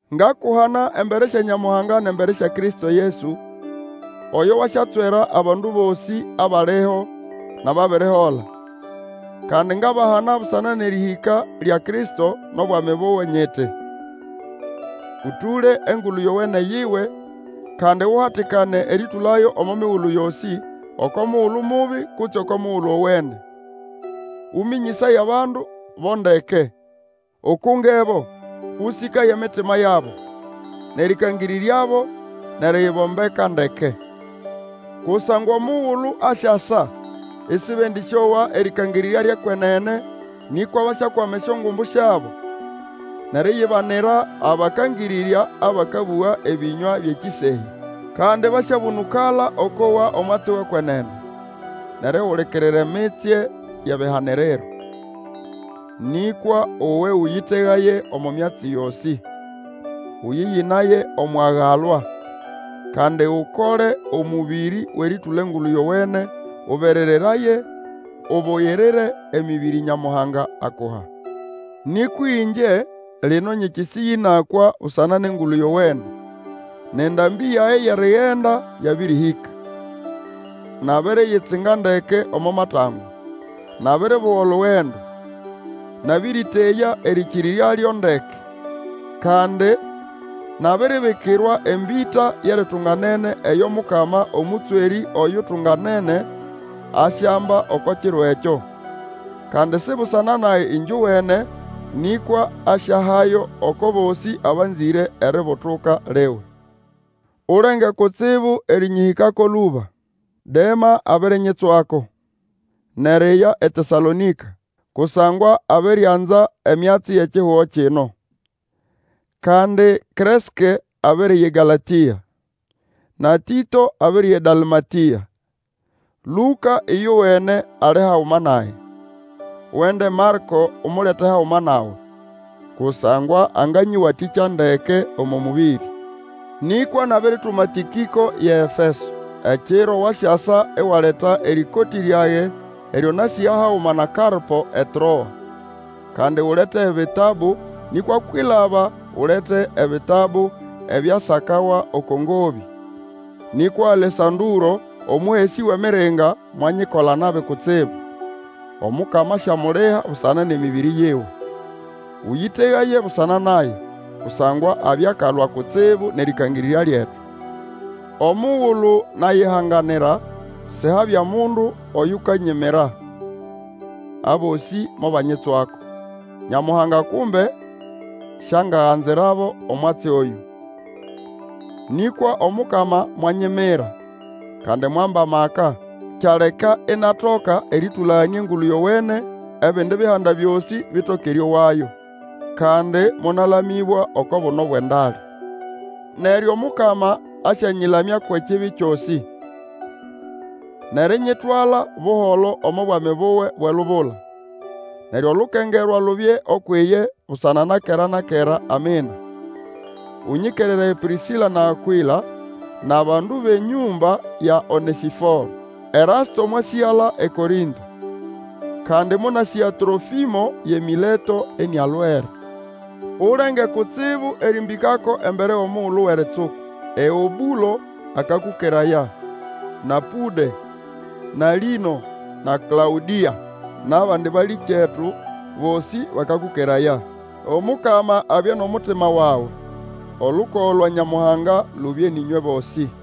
Ngakuhana embere sya Nyamuhanga nʼembere sya Kristo Yesu, oyo wasyatswera abandu bosĩ, abaliho, nʼababirihola. Kandi ngabahana busana nʼerĩhĩka lya Kristo nʼobwami buwe, nyiti, Ũtũle Engulu Yowene yiwe, kandi uhatikane erĩtũlayo omo migulu yosĩ, oko mugulu mubi, kutse oko mugulu owene. Ũmĩnyĩsaye abandu bo ndeke, ukungebo, Ũsĩkaye emitima yabo, nʼerĩkangĩrĩryabo nʼeriyibombeka ndeke. Kusangwa omugulu asyasa isibendĩsyowa erĩkangĩrĩrya lyʼekwenene, nĩkwa basyakwama esyongumbu syabo, nʼeriyibanira abakangĩrĩrya abakabũga ebĩnywa byʼekĩsehya. Kandi basyabũnũkala okwʼowa omwatsi wʼekwenene, nʼerihulikirira emitsye yʼebihaniriro. Nĩkwa uwe Ũyĩtegaye omo myatsi yosĩ; ũyĩyĩnaye omwʼiagalwa, kandi Ukole omũbĩrĩ wʼerĩtũla Engulu Yowene, Ũberereraye ubugirire emĩbĩrĩ Nyamuhanga akuha. Nĩkwa ĩngye, lino nyĩkĩsĩya ĩnakwa busana nʼEngulu Yowene, nʼendambĩ yage yʼerigenda yabĩrĩhĩka. Nabiriyitsinga ndeke omo matangwa, nabiribuga olugendo, nabĩrĩteya erĩkĩrĩrya lyo ndeke. Kandi nabiribikirwa embĩta yʼeritunganene eyo Mukama, Omũtswerĩ oyutunganene, asyamba oko Kiro ekyo. Kandi si busana nage ĩngyowene, nĩkwa asyahayo oko bosĩ abanzĩre eributuka liwe. Ulenge kutsibu erĩnyĩhĩkako lũba. Dema abirinyitswako, nʼeriya eTesalonĩka, kusangwa abirianza emyatsi yʼekihugo kino. Kandi Kreske abiriya eGalatĩa, na Tĩto abiriya eDalmatĩa. Lũka ĩyowene ali haguma nage. Wende Marĩko Umulete haguma nawe, kusangwa anganyĩwatĩkya ndeke omo mũbĩrĩ. Nĩkwa nabirituma Tĩkĩko yʼeEfeso. Ekiro wasyasa iwaleta erĩkotĩ ryage eryo nasĩga haguma na Karpo eTroa; kandi ulete ebitabu, nĩkwa kwilaba ulete ebitabu ebyasakawa oko ngobĩ. Nĩkwa Alesandũro, omũhesĩ wʼemiringa, mwanyikola nabi kutsibu, Omukama asyamuliha busana nʼemĩbĩrĩ yiwe. Ũyĩtegaye busana naye, kusangwa abya akalwa kutsibu nʼerĩkangĩrĩrya lyetu. Omugulu nayihanganira, sihabya mundu oyukanyimira, abosĩ mobanyitswako. Nyamuhanga kumbe siangaganzirabo omwatsi oyũ! Nĩkwa Omukama mwanyimira, kandi mwamba amaka, kyaleka inatoka erĩtũlaganĩa Engulu Yowene, ebindi Bihanda byosĩ bitoke erĩowayo. Kandi monalamĩbwa oko buno bwʼendale. Neryo Omukama asyanyĩlamya kwʼekibi kyosĩ, nʼerinyitwala buholo omo Bwami buwe bwʼelubula. Neryo olukengerwa lubye ukwʼiye busana na kera na kera. Amina. Ũnyĩkereraye Pĩrĩsĩla na Akwĩla, nʼabandu bʼenyũmba ya Onesĩforo. Erasto mwasĩgala eKorĩnto, kandi monasĩga Trofĩmo yʼeMĩleto inialwere. Ulenge kutsibu erĩmbĩkako embere wʼomugulu wʼeritsuku. Eũbũlo, akakũkeraya, na Pũde, na Lĩno, na Klaũdĩa, nʼabandi balĩkyetu bosĩ bakakũkeraya. Omukama abye nʼomutima wawe. Olukogo lwa Nyamuhanga lubye nʼĩnywe bosĩ.